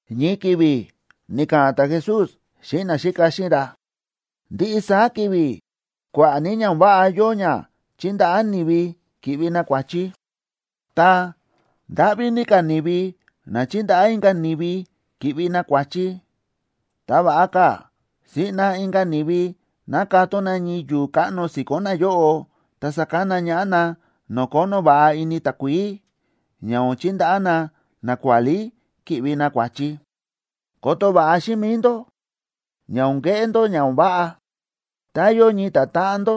Ñii ki̱vi̱ ni̱ka̱ꞌa̱n ta̱Jesús xíꞌin naxíka xíꞌin ra: ―Ndiꞌi saá ki̱vi̱ kua̱ꞌa̱ ní ña o̱n váꞌa yóo ña chíndaꞌá ni̱vi ki̱ꞌvi na kua̱chi. Ta, ¡ndáꞌví ní ka̱ ni̱vi na chíndaꞌá inka̱ ni̱vi ki̱ꞌvi na kua̱chi! Ta va̱ꞌa ka̱ siꞌna inka̱ ni̱vi ná katón na ñii yu̱u̱ káꞌno si̱ko̱n nayóꞌo, ta sakana ñaꞌá na no̱o̱ kónó va̱ꞌa ini takuií, ña o̱n chindaꞌá na nakuálí ki̱ꞌvi na kua̱chi. Koto va̱ꞌa xíꞌin mi̱i ndó ña o̱n keꞌé ndó ña o̱n váꞌa. Tá yóo ñii ta̱táꞌan ndó,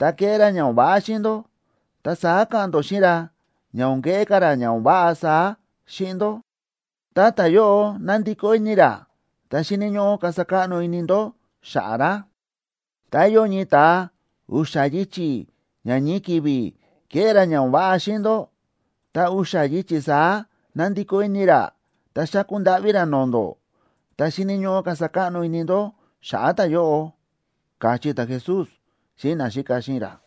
ta kéꞌé ra ña o̱n váꞌa xíꞌin ndó, ta saá ka̱ꞌa̱n ndó xíꞌin ra ña o̱n keꞌé ka̱ ra ña o̱n váꞌa saá xíꞌin ndó. Tá ta̱yóꞌo nandikó ini ra, ta xíni̱ ñóꞌó kasa káꞌno ini ndó xa̱ꞌa̱ ra. Tá yóo ñii ta̱a u̱xa̱ yichi̱ ña ñii ki̱vi̱ ke̱ꞌé ra ña o̱n váꞌa xíꞌin ndó, ta u̱xa̱ yichi̱ saá na̱ndikó ini ra ta xáku ndáꞌví ra no̱o̱ ndó, ta xíni̱ ñóꞌó kasa káꞌno ini ndó xa̱ꞌa̱ ta̱yóꞌo ―káchí ta̱Jesús xíꞌin naxíka xíꞌin ra.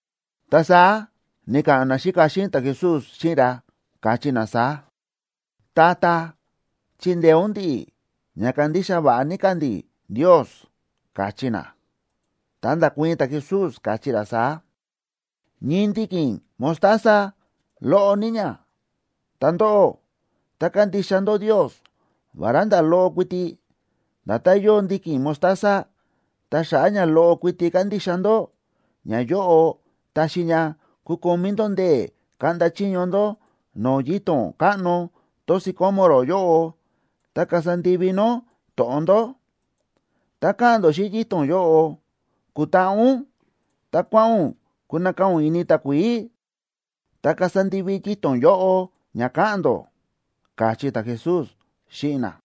Ta saá ni̱ka̱ꞌa̱n naxíka xíꞌin ta̱Jesús xíꞌin ra, káchí na saá: ―Tata, chindeé ún ndi̱ꞌi̱ ña kandixa va̱ꞌa ní ka̱ ndi̱ Ndios ―káchí na. Ta nda̱kuii̱n ta̱Jesús, káchí ra saá: ―Ñii ndiki̱n mostaza, loꞌo ní ña. Ta ndóꞌó, tá kandixa ndó Ndios, vará nda̱ loꞌo kuiti, nda̱tán yóo ndiki̱n mostaza, ta xa̱ꞌa̱ ña loꞌo kuiti kandixa ndó, ñayóꞌo taxi ña kukomí ndó ndee̱ kaꞌnda chiño ndó no̱o̱ yito̱n káꞌno tón sicómoro yóꞌo, ta kasa ndivi nó to̱ꞌon ndó. Tá ka̱ꞌa̱n ndó xíꞌin yito̱n yóꞌo: “Kutaꞌa ún, ta kua̱ꞌa̱n ún kunakaa̱ ún ini takuií”, ta kasa ndivi yito̱n yóꞌo ña ka̱ꞌa̱n ndó ―káchí ta̱Jesús xíꞌin na.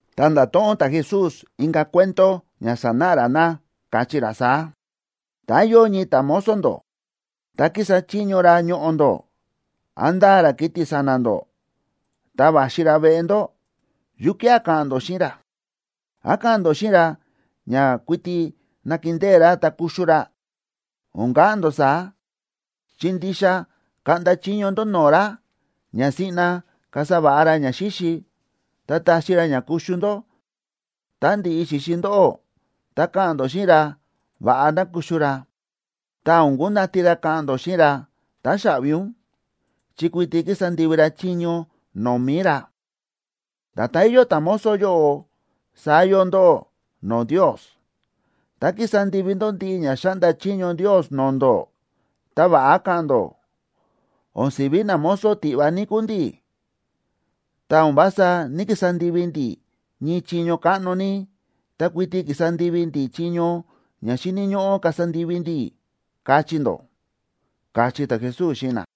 Ta nda̱to̱ꞌon ta̱Jesús inka̱ cuento ña sanáꞌa ra na, káchí ra saá: ―Tá yóo ñii ta̱mozo ndó, ta kísa chiño ra ñoꞌo̱ ndó, án ndáa ra kiti̱ sa̱na̱ ndó, ta va̱xi ra veꞌe ndó, ¿yukía̱ ka̱ꞌa̱n ndó xíꞌin ra? ¿Án ka̱ꞌa̱n ndó xíꞌin ra ña kuiti nakindée ra ta kuxu ra? O̱n ka̱ꞌa̱n ndó saá, chi ndixa kaꞌnda chiño ndó no̱o̱ ra ña siꞌna kasa va̱ꞌa ra ñaxíxi, ta taxi ra ña kuxu ndó. Tá ndi̱ꞌi xi̱xi ndóꞌó, ta ka̱ꞌa̱n ndó xíꞌin ra va̱ꞌa ná kuxu ra. Ta o̱n kundati ra ka̱ꞌa̱n ndó xíꞌin ra: “Táxaꞌvi ún”, chi kuiti ki̱sa ndivi ra chiño no̱o̱ mi̱i ra. Nda̱tán yóo ta̱mozo yóꞌo, saá yóo ndóꞌó no̱o̱ Ndios. Tá ki̱sa ndivi ndó ndiꞌi ña xa̱ꞌnda chiño Ndios no̱o̱ ndó, ta va̱ꞌa ka̱ꞌa̱n ndó: “O̱n si̱ví namozo tiꞌva ní kúu ndi̱, ta o̱n vása ní‑kisa ndivi ndi̱ ñii chiño káꞌno ní, ta kuiti ki̱sa ndivi ndi̱ chiño ña xíni̱ ñóꞌó kasa ndivi ndi̱”, kachí ndó ―káchí ta̱Jesús xíꞌin na.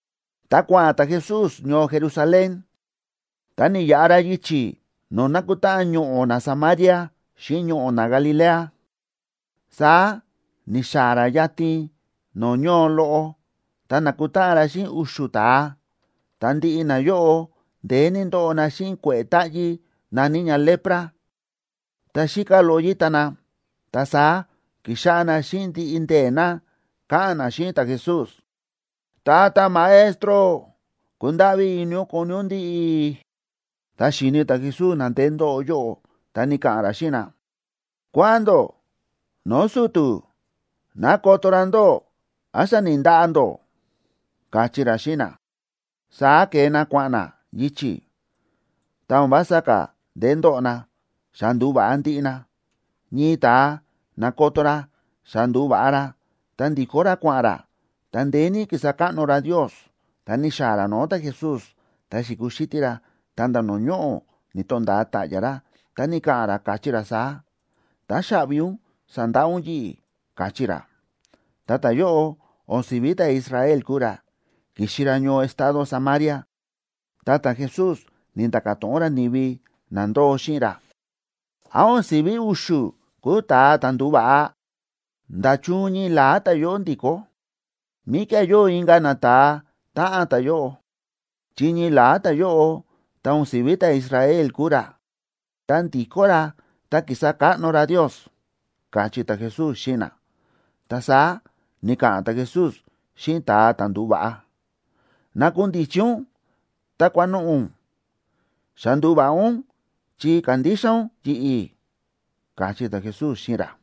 Tá kua̱ꞌa̱n ta̱Jesús ñoo Jerusalén, ta ni̱yaꞌa ra yichi̱ no̱o̱ nákutáꞌan ñoꞌo̱ naSamaria xíꞌin ñoꞌo̱ naGalilea. Saá ni̱xaa̱ ra yatin no̱o̱ ñoo loꞌo, ta na̱kutáꞌan ra xíꞌin u̱xu̱ ta̱a, ta ndiꞌi nayóꞌo ndeé ní ndóꞌo na xíꞌin kue̱ꞌe̱ táꞌyí na̱ní ña lepra. Ta xíká loꞌo yíta na. Ta saá ki̱xáꞌá na xíꞌin ndiꞌi ndee̱ na, káꞌa̱n na xíꞌin ta̱Jesús: ―¡Tata Maestro, kundáꞌví ini ún koni ún ndi̱ꞌi̱! Tá xi̱ni̱ ta̱Jesús na ndeé ndóꞌo yóꞌo, ta ni̱ka̱ꞌa̱n ra xíꞌin na: ―Kua̱ꞌa̱n ndó no̱o̱ su̱tu̱ ná koto ra ndóꞌó án xa ni̱ndaꞌa ndó ―káchí ra xíꞌin na. Saá ke̱e na kua̱ꞌa̱n na yichi̱, ta o̱n vása ka̱ ndeé ndóꞌo na, xa ndu̱va̱ꞌa ndiꞌi na. Ñii ta̱a na̱koto ra xa ndu̱va̱ꞌa ra, ta ndi̱kó ra kua̱ꞌa̱n ra, ta ndeé ní kísa káꞌno ra Ndios. Tá ni̱xaa̱ ra no̱o̱ ta̱Jesús, ta xi̱kuxítí ra, ta̱nda̱ no̱o̱ ñoꞌo̱ ni̱to̱nda̱a ta̱ꞌya̱ ra, ta ni̱ka̱ꞌa̱n ra, káchí ra saá: ―Táxaꞌvi ún sa̱ndaꞌa ún yi̱ꞌi̱ ―káchí ra. Ta ta̱yóꞌo o̱n si̱ví ta̱Israel kúu ra, ki̱xi ra ñoo estado Samaria. Ta ta̱Jesús ni̱nda̱ka̱ to̱ꞌon ra ni̱vi na ndóo xíꞌin ra: ―¿Án o̱n si̱ví u̱xu̱ kúu ta̱a ta̱ ndu̱va̱ꞌa? ¿Nda̱chun ñii la̱á ta̱yóꞌo ndi̱kó? ¿Míkía̱ yóo inka̱ nata̱a táꞌan ta̱yóꞌo? Chi ñii la̱á ta̱yóꞌo, ta o̱n si̱ví ta̱Israel kúu ra, ta ndi̱kó ra ta kísa káꞌno ra Ndios ―káchí ta̱Jesús xíꞌin na. Ta saá ni̱ka̱ꞌa̱n ta̱Jesús xíꞌin ta̱a ta̱ ndu̱va̱ꞌa: ―Nakundichi ún, ta kua̱noꞌo̱ ún. Xa ndu̱va̱ꞌa ún chi ka̱ndixa ún yi̱ꞌi̱ ―káchí ta̱Jesús xíꞌin ra.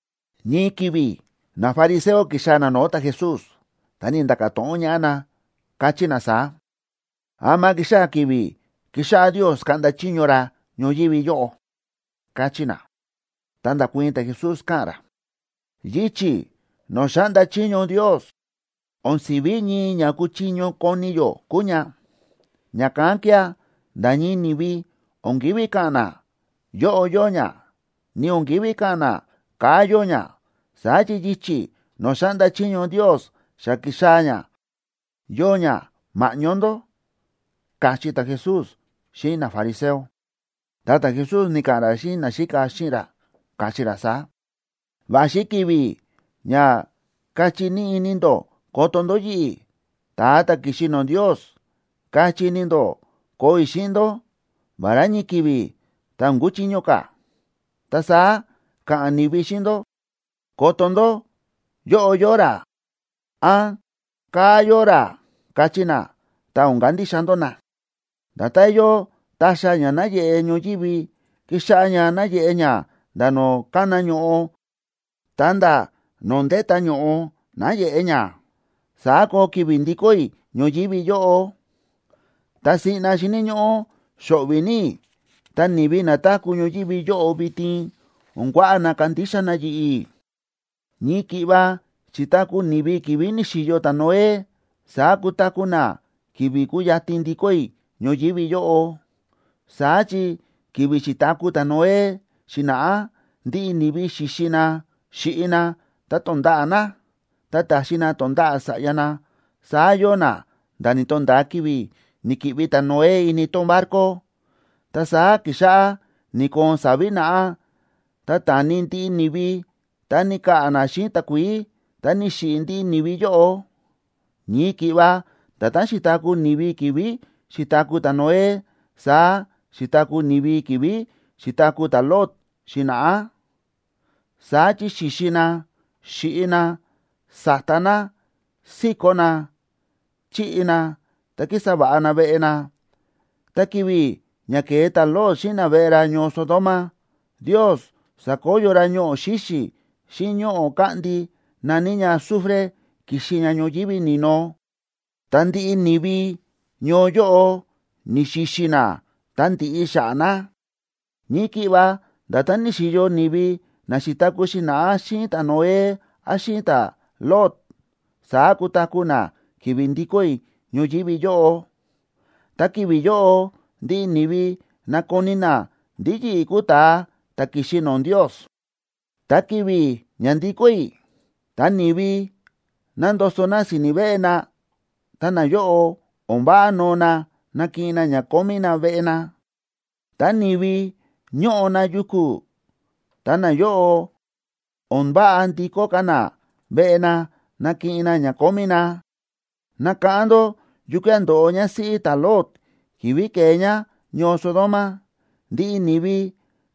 Ñii ki̱vi̱ nafariseo ki̱xaa̱ na no̱o̱ ta̱Jesús, ta ni̱nda̱ka̱ to̱ꞌon ñaꞌá na, káchí na saá: ―¿Ama kixaa̱ ki̱vi̱ kixáꞌá Ndios kaꞌnda chiño ra ñoyívi yóꞌo? ―káchí na. Ta nda̱kuii̱n ta̱Jesús, káꞌa̱n ra: ―Yichi̱ no̱o̱ xáꞌnda chiño Ndios, o̱n si̱ví ñii ña kúchiño koni yó kúu ña. Ña̱kán kía̱ nda̱ ñii ni̱vi o̱n kívi ka̱ꞌa̱n na: “Yóꞌo yóo ña”, ni o̱n kívi ka̱ꞌa̱n na: “Kaa̱ yóo ña.” Saá chi yichi̱ no̱o̱ xáꞌnda chiño Ndios xa ki̱xaa̱ ña, yóo ña ma̱ꞌñó ndó ―káchí ta̱Jesús xíꞌin nafariseo. Ta ta̱Jesús ni̱ka̱ꞌa̱n ra xíꞌin naxíka xíꞌin ra, káchí ra saá: ―Va̱xi ki̱vi̱ ña kachí ní ini ndó koto ndó yi̱ꞌi̱, ta̱a ta̱ ki̱xi no̱o̱ Ndios. Kachí ini ndó koo i̱ xíꞌin ndó, vará ñii ki̱vi̱, ta o̱n kuchiño ka̱. Ta saá ka̱ꞌa̱n ni̱vi xíꞌin ndó: “¡Koto ndó! Yóꞌo yóo ra”, án “Kaa̱ yóo ra”, kachí na, ta o̱n kandixa ndó na. Nda̱tán yóo ta̱xa̱ ña náyeꞌe ñoyívi, kíxáꞌá ña náyeꞌe ña nda̱ no̱o̱ kána ño̱ꞌo ta̱nda̱ no̱o̱ ndéta ño̱ꞌo náyeꞌe ña, saá koo ki̱vi̱ ndikó i̱ ñoyívi yóꞌo. Ta siꞌna xíni̱ ñóꞌó xo̱ꞌvi̱ ní i̱, ta ni̱vi na táku̱ ñoyívi yóꞌo vitin o̱n kuaꞌa na kandixa na yi̱ꞌi̱. Ñii ki̱ꞌva xi̱taku̱ ni̱vi ki̱vi̱ ni̱xi̱yo ta̱Noé, saá kutaku̱ na ki̱vi̱ kuyatin ndikó i̱ ñoyívi yóꞌo. Saá chi ki̱vi̱ xi̱taku̱ ta̱Noé xi̱na̱ꞌá ndiꞌi ni̱vi xíxi na, xíꞌi na, ta tónda̱ꞌa̱ na, ta táxi na tonda̱ꞌa̱ sa̱ꞌya na, saá yóo na nda̱ ni̱to̱nda̱a ki̱vi̱ ni̱ki̱ꞌvi ta̱Noé ini tón barco. Ta saá ki̱xáꞌá ni̱koon sa̱vi̱ naꞌá, ta ta̱ni ndiꞌi ni̱vi ta ni̱ka̱ꞌa̱ na xíꞌin takuií, ta ni̱xiꞌi̱ ndiꞌi ni̱vi yóꞌo. Ñii ki̱ꞌva nda̱tán xi̱taku̱ ni̱vi ki̱vi̱ xi̱taku̱ ta̱Noé, saá xi̱taku̱ ni̱vi ki̱vi̱ xi̱taku̱ ta̱Lot xi̱na̱ꞌá. Saá chi xíxi na, xíꞌi na, sáta na, síkó na, chíꞌi na, ta kísa va̱ꞌa na veꞌe na. Ta ki̱vi̱ ña ke̱e ta̱Lot xíꞌin naveꞌe ra ñoo Sodoma, Ndios sa̱koyo ra ñoꞌo̱ xíxi̱ xíꞌin ñoꞌo̱ káꞌndi na̱ní ña azufre ki̱xi ña ñoyívi ni̱no, ta ndiꞌi ni̱vi ñoo yóꞌo ni̱xi̱xi̱ na ta ndi̱ꞌi xa̱ꞌa̱ na. Ñii ki̱ꞌva nda̱tán ni̱xi̱yo ni̱vi na xi̱taku̱ xi̱na̱ꞌá xíꞌin ta̱Noé án xíꞌin ta̱Lot, saá kutaku̱ na ki̱vi̱ ndikó i̱ ñoyívi yóꞌo, ta ki̱vi̱ yóꞌo ndiꞌi ni̱vi nakoni na ndí yi̱ꞌi̱ kúu ta̱a ta̱ ki̱xi no̱o̱ Ndios. ’Ta ki̱vi̱ ña ndikó i̱, tá ni̱vi nándoso na si̱ni̱ veꞌe na, ta nayóꞌo o̱n váꞌa noo na nakiꞌin na ña kómí na veꞌe na. Tá ni̱vi ñóꞌo na yuku̱, ta nayóꞌo, o̱n váꞌa ndikó ka̱ na veꞌe na nakiꞌin na ña kómí na. Nakáꞌán ndó yukía̱ ndo̱ꞌo ñásíꞌí ta̱Lot ki̱vi̱ ke̱e ñá ñoo Sodoma.a Ndiꞌi ni̱vi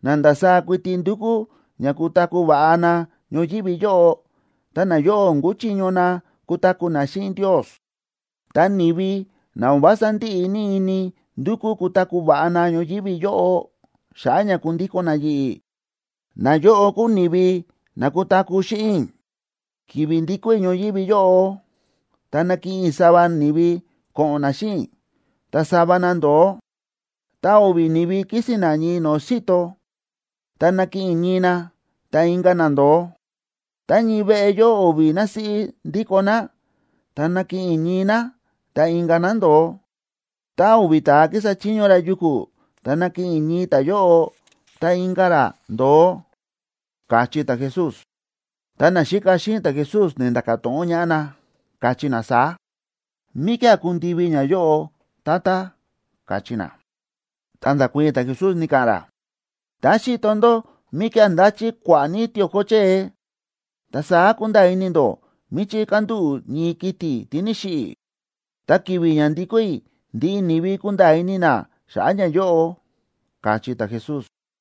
na ndasaá kuiti ndúkú ña kutaku̱ va̱ꞌa na ñoyívi yóꞌo, ta nayóꞌo o̱n kuchiño na kutaku̱ na xíꞌin Ndios. Ta ni̱vi na o̱n vása ndíꞌi ní ini ndukú kutaku̱ va̱ꞌa na ñoyívi yóꞌo, xa̱ꞌa̱ ña kundíko̱n na yi̱ꞌi̱, nayóꞌo kúu ni̱vi na kutaku̱ xíꞌin i̱. ’Ki̱vi̱ ndikó i̱ ñoyívi yóꞌo, ta nakiꞌin i̱ sava ni̱vi ko̱ꞌo̱n na xíꞌin i̱, ta sava na ndo̱o. Tá o̱vi̱ ni̱vi kísi̱n na ñii no̱o̱ xi̱to, ta nakiꞌin i̱ ñii na, ta inka̱ na ndo̱o. Tá ñii veꞌe yóo o̱vi̱ násíꞌí ndíko ná, ta nakiꞌin i̱ ñii ñá, ta inka̱ ñá ndo̱o. Tá o̱vi̱ ta̱a kísa chiño ra yuku̱, ta nakiꞌin i̱ ñii ta̱yóꞌo, ta inka̱ ra ndo̱o ―káchí ta̱Jesús. Ta naxíka xíꞌin ta̱Jesús ni̱nda̱ka̱ to̱ꞌon ñaꞌá na, káchí na saá: ―¿Míkía̱ kundivi ñayóꞌo?, Tata ―káchí na. Ta nda̱kuii̱n ta̱Jesús ni̱ka̱ꞌa̱n ra: ―Tá xíto ndó míkía̱ ndáchí kua̱ꞌa̱ ní tio̱ko chée,b ta saá kúnda̱a̱ ini ndó míchí kándúꞌu̱ ñii kiti̱ tí ni̱xiꞌi̱. Ta ki̱vi̱ ña ndikó i̱, ndiꞌi ni̱vi kunda̱a̱ ini na xa̱ꞌa̱ ñayóꞌo ―káchí ta̱Jesús.